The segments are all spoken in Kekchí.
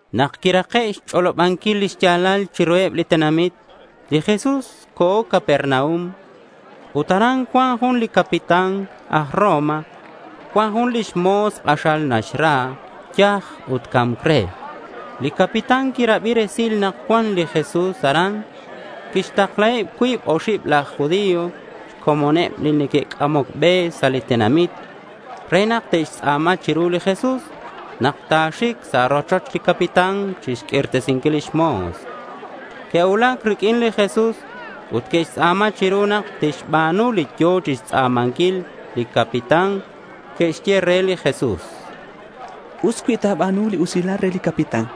Nak quirake' xch'olobanquil lix ya̱lal chiruheb li tenamit, li Jesús co̱ Capernaum. Ut aran cuan jun li capitán aj Roma cuan jun lix mo̱s k'axal naxra. Yaj ut ca̱mc re. Li capitán quirabi resil nak cuan li Jesús aran. Quixtaklaheb cuib oxib laj judío xcomoneb li neque'c'amoc be sa' li tenamit re nak te'xtz'a̱ma chiru li Jesús nak ta̱xic sa' rochoch li capitán chixq'uirtesinquil lix mo̱s. Que'cuulac riq'uin li Jesús ut que'xtz'a̱ma chiru nak tixba̱nu li yo̱ chixtz'a̱manquil li capitán. Que'xye re li Jesús: —Us cui ta̱ba̱nu li usilal re li capitán,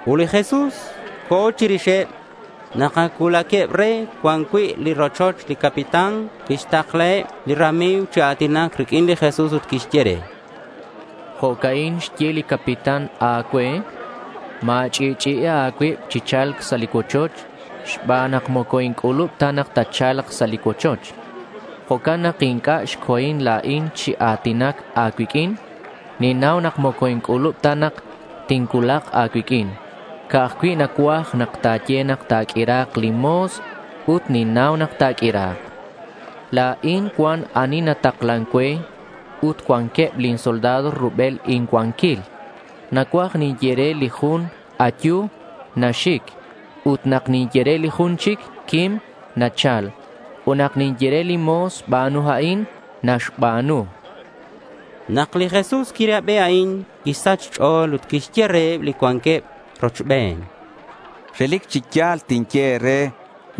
Ut li Jesús co̱ chirixeb. Nak ac cuulaqueb re cuan cui' li rochoch, li capitán quixtaklaheb li rami̱g chi a̱tinac riq'uin li Jesús ut que'xye re: —Jo'ca'in xye li capitán a̱cue: Ma̱ch'i'ch'i'i a̱cuib chi cha̱lc sa' cuochoch xban nak moco inc'ulub ta nak tatcha̱lk sa' cuochoch. Jo'can nak inc'a' xco̱in la̱in chi a̱tinac a̱cuiq'uin. Ninnau nak moco inc'ulub ta nak tincuulak a̱cuiq'uin. Ca'aj cui' nacuaj nak ta̱ye nak ta̱q'uira̱k lin mo̱s ut ninnau nak ta̱q'uira̱k. La̱in cuan ani nataklan cue ut cuanqueb lin soldado rubel incuanquil. Nak ninye re li jun “ayu”, naxic. Ut nak ninye re li jun chic “quim”, nachal. Ut nak ninye re lin mo̱s, “ba̱nu a'in”, naxba̱nu, chan li capitán. Nak li Jesús quirabi a'in, quisach xch'o̱l ut quixye reheb li cuanqueb rochben: —Relic chi ya̱l tinye e̱re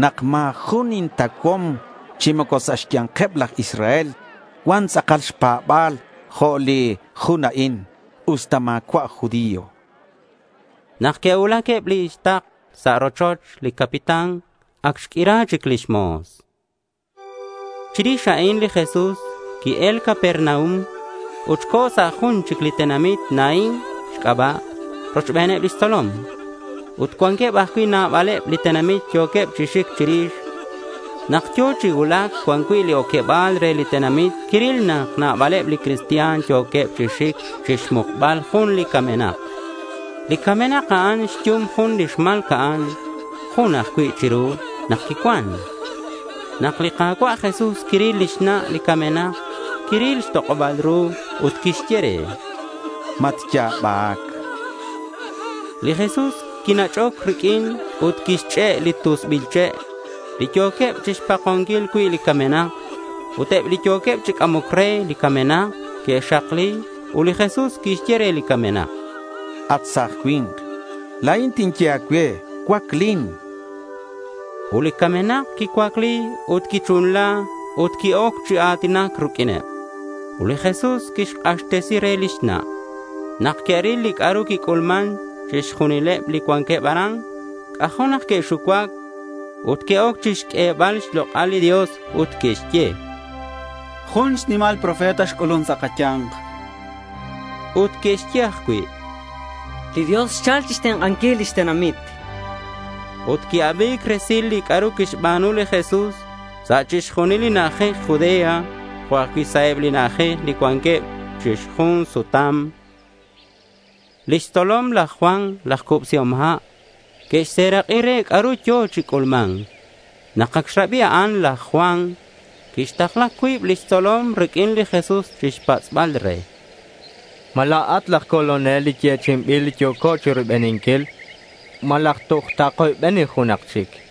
nak ma̱ jun intauhom chi moco sa' xya̱nkeb laj Israel cuan tz'akal xpa̱ba̱l jo' li jun a'in, usta ma̱cua' aj judío, chan. Nak que'cuulac eb li takl sa' rochoch li capitán, ac xq'uira chic lix mo̱s. Chirix a'in li Jesús qui-el Capernaum ut co̱ sa' jun chic li tenamit Naín xc'aba' rochbeneb lix tzolom. Ut cuanqueb ajcui' nabaleb li tenamit yo̱queb chi xic chirix. Nak yo̱ chi cuulac cuan cui' li oqueba̱l re li tenamit quiril nak nabaleb li cristian yo̱queb chi xic chixmukbal jun li camenak. Li camenak a'an xyum jun li xma̱lca'an. Jun ajcui' chiru nak quicuan. Nak li Ka̱cua' Jesús quiril li xna' li camenak, quiril xtok'oba̱l ru ut quixye re: —Matya̱bac, chan. Li Jesús quinach'oc riq'uineb ut quixch'e' li tusbil che' li yo̱queb chixpakonquil cui' li camenak. Ut eb li yo̱queb chi c'amoc re li camenak que'xakli ut li Jesús quixye re li camenak: —At sa̱j cui̱nk, la̱in tinye a̱cue, cuaclin, chan. Ut li camenak quicuacli ut quichunla ut qui-oc chi a̱tinac riq'uineb. Ut li Jesús quixk'axtesi re lix na'. Nak que'ril li c'a'ru quic'ulman chixjunileb li cuanqueb aran, c'ajo' nak que'xucuac ut que'oc chixq'uebal xlok'al li Dios. Ut que'xye: —Jun xnimal ru profeta xc'ulun sa' kaya̱nk.— Ut que'xye ajcui': —Li Dios xchal chixtenk'anquil lix tenamit, chanqueb. Ut qui-abi̱c resil li c'a'ru quixba̱nu li Jesús sa' chixjunil li na'ajej Judea jo' ajcui' sa' eb li na'ajej li cuanqueb chi xjun sutam. Lix tzolom laj Juan laj Cubsihom Ha' que'xserak'i re c'a'ru yo̱ chi c'ulma̱nc. Nak ac xrabi a'an, laj Juan quixtakla cuib lix tzolom riq'uin li Jesús chixpatz'bal re: —¿Ma la̱at laj Colonel li yechi'inbil li yo̱co chiroybeninquil? ¿Malaj toj takoybeni junak chic?—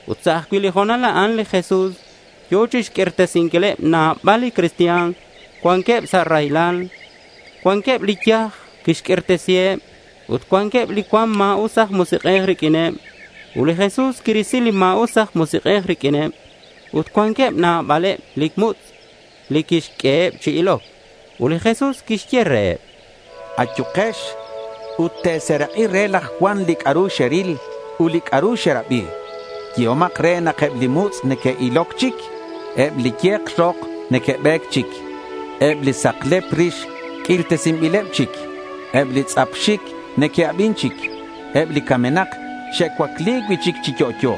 Ut sa' li ho̱nal a'an li Jesús yo̱ chixq'uirtesinquileb nabaleb li cristian li cuanqueb sa' raylal. Cuanqueb li yaj quixq'uirtesiheb. Ut cuanqueb li cuan ma̱us aj musik'ej riq'uin ut li Jesús quirisi li ma̱us aj musik'ej riq'uineb. Ut cuanqueb nabaleb li mutz' li quixq'ueheb chi iloc. Ut li Jesús quixye reheb: —Ayukex ut te̱serak'i re laj Juan li c'a'ru xeril ut li c'a'ru xerabi. Yehomak re nak eb li mutz' neque'iloc chic; eb li ye̱k rok neque'be̱c chic; eb li saklep rix q'uirtesinbileb chic; eb li tz'ap xic neque'abin chic; eb li camenak xe'cuaclesi̱c cui'chic chi yo'yo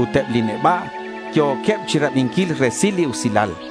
ut eb li neba' yo̱queb chirabinquil resil li usilal.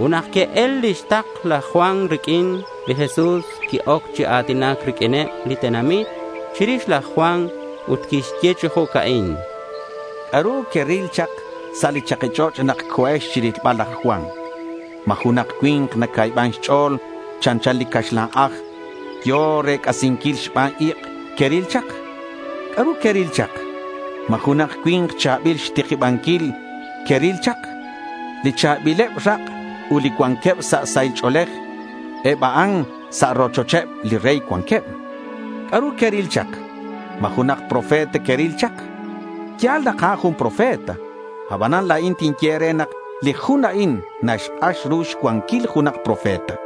Ut nak que'el lix takl laj Juan riq'uin, li Jesús qui-oc chi a̱tinac riq'uineb li tenamit chirix laj Juan ut quixye chi jo'ca'in: —¿C'a'ru queril chak sa' li chaki ch'och' nak co̱ex chirilbal laj Juan? ¿Ma junak cui̱nk nacuiban xch'o̱l chanchan li caxlan aj yo̱ rec'asinquil xban ik' queril chak? ¿C'a'ru queril chak? ¿Ma junak cui̱nk cha̱bil xtikibanquil queril chak? Li cha̱bileb rak' ut li cuanqueb sa' sahil ch'o̱lej, eb a'an sa' rochoch eb li rey cuanqueb. ¿C'a'ru queril chak? ¿Ma junak profeta queril chak? Ya̱l nak a'an jun profeta. Abanan la̱in tinye e̱re nak li jun a'in naxk'ax ru xcuanquil junak profeta.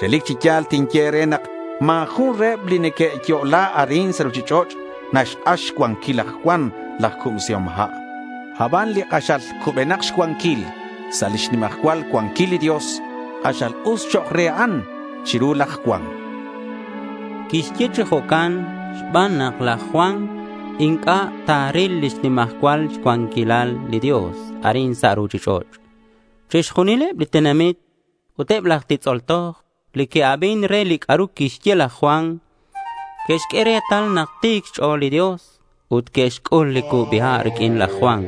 Relic chi ya̱l tinye e̱re nak ma̱ jun reheb li neque'yo'la arin sa' ruchich'och' naxk'ax xcuanquil laj Juan laj Cubsihom Ha'. Aban li k'axal cubenak xcuanquil sa' lix nimajcual cuanquil li Dios, k'axal us chok' re a'an chiru laj Juan, chan li Jesús. (Quixye chi jo'can xban nak laj Juan inc'a' ta̱ril lix nimajcual cuanquilal li Dios arin sa' ruchich'och'). Chixjunileb li tenamit ut eb laj titz'ol toj li que'abin re li c'a'ru quixye laj Juan, que'xq'ue retal nak ti̱c xch'o̱l li Dios ut que'xc'ul li cubi ha' riq'uin laj Juan.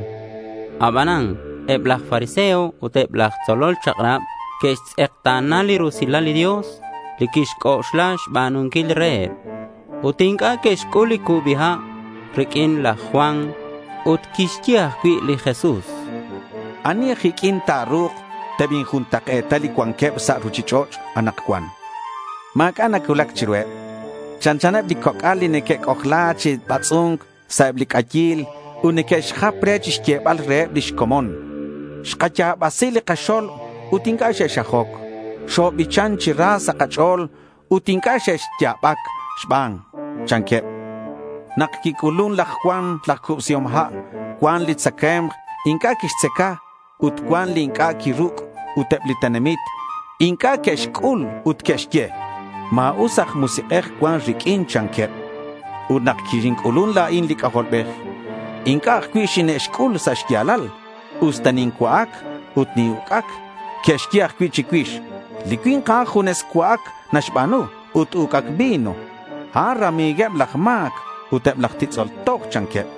Abanan eb laj fariseo ut eb laj tzolol chak'rab que'xtz'ekta̱na li rusilal li Dios li quixc'oxla xba̱nunquil reheb. Ut inc'a' que'xc'ul li cubi ha' riq'uin laj Juan. Ut quixye ajcui' li Jesús: —¿Ani aj iq'uin ta̱ru̱k tebinjuntak'e̱ta li cuanqueb sa' ruchich'och' anakcuan? Ma̱c'a' nacuulac chiruheb. Chanchaneb li coc'al li neque'c'ojla chi batz'u̱nc sa' eb li c'ayil ut neque'xjap re chixyebal reheb lix comon, “Xkaya̱basi li kaxo̱lb ut inc'a' xexxajoc; xobichan chi ra sa' kach'o̱l ut inc'a' xexya̱bac xban”, chanqueb. Nak quic'ulun laj Juan laj Cubsihom ha', cuan li tzacae̱mk inc'a' quixtzaca ut cuan li inc'a' quiruc', ut eb li tenamit inc'a' que'xc'ul ut que'xye: “Ma̱us aj musik'ej cuan riq'uin”, chanqueb. Ut nak xinc'ulun la̱in li C'ajolbej inc'a' ajcui' xine'xc'ul sa' xya̱lal usta nincua'ac ut nin-uc'ac. Que'xye ajcui' chicuix, “Li cui̱nk a'an junes cua'ac naxba̱nu ut uc'ac vino. A'an rami̱gueb laj ma̱c ut eb laj titz'ol toj”, chanqueb.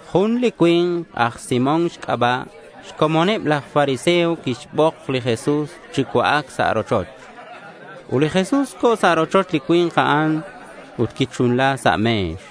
Jun li cui̱nk aj Simón xc'aba' xcomoneb laj fariseo quixbok li Jesús chi cua'ac sa' rochoch. Ut li Jesús co̱ sa' rochoch li cui̱nk a'an ut quichunla sa' me̱x.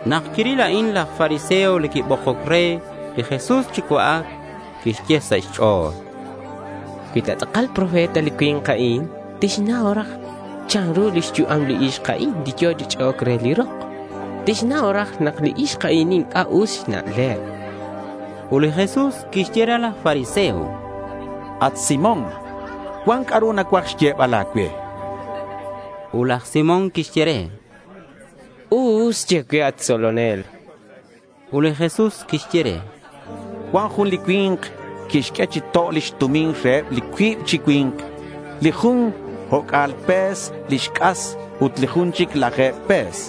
Nak quiril a'in laj fariseo li quibokoc re li Jesús chi cua'ac, quixye sa' xch'o̱l: Cui ta tz'akal profeta li cui̱nk a'in tixnau raj chanru lix yu'am li ixk a'in li yo̱ chi ch'e'oc re li rok. Tixnau raj nak li ixk a'in inc'a' us xna'leb. Ut li Jesús quixye re laj fariseo: —At Simón, cuan c'a'ru nacuaj xyebal a̱cue, chan re. Ut laj Simón quixye re: —Us. Ye cue, at tzolonel.— Ut li Jesús quixye re: —Cuan jun li cui̱nk quixq'ue chi to' lix tumin reheb cuib chi cui̱nk. Li jun o'c'a̱l pe̱s lix c'as ut li jun chic laje̱b pe̱s.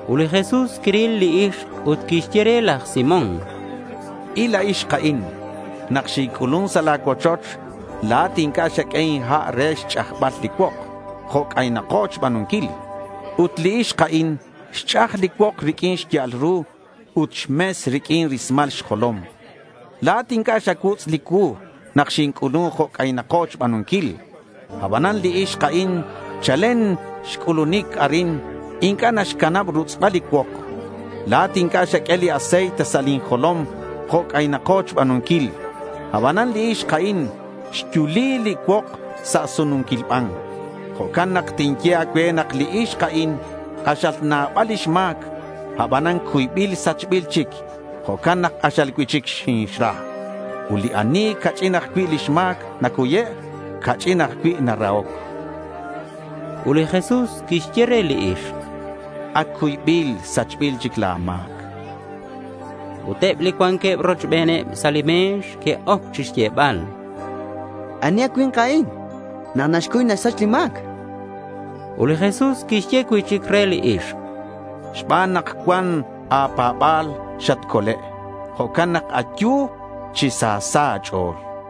Ut li Jesús quiril li ixk ut quixye re laj Simón: —Il a ixk a'in. Nak xinc'ulun sa' la̱ cuochoch, la̱at inc'a' xaq'ue inha' re xch'ajbal li cuok jo' c'aynako xba̱nunquil. Ut li ixk a'in xch'aj li cuok riq'uin xya'al ru ut xmes riq'uin rismal xjolom. La̱at inc'a' xacuutz' li cuu nak xinc'ulun jo' c'aynako xba̱nunquil. Abanan li ixk a'in chalen xc'ulunic arin inc'a' naxcanab rutz'bal li cuok. La̱at inc'a' xaq'ue li aceite sa' lin jolom jo' c'aynako xba̱nunquil, abanan li ixk a'in xyuli li cuok sa' sununquil ban. Jo'can nak tinye a̱cue nak li ixk a'in k'axal nabal lix ma̱c. Abanan cuybil sachbil chic. Jo'can nak k'axal cui'chic xinixra. Ut li ani ca'ch'in ajcui' lix ma̱c nacuye', ca'ch'in ajcui' narahoc, chan. Ut li Jesús quixye re li ixk: —Ac cuybil sachbil chic la̱ ma̱c, chan. Ut eb li cuanqueb rochbeneb sa' li me̱x que'oc chixyebal: —¿Ani a cui̱nk a'in nak naxcuy naxsach li ma̱c? chanqueb. Ut li Jesús quixye cui'chic re li ixk: —Xban nak cuan a̱pa̱ba̱l, xatcole'. Jo'can nak ayu chi sa sa' a̱ch'o̱l, chan re.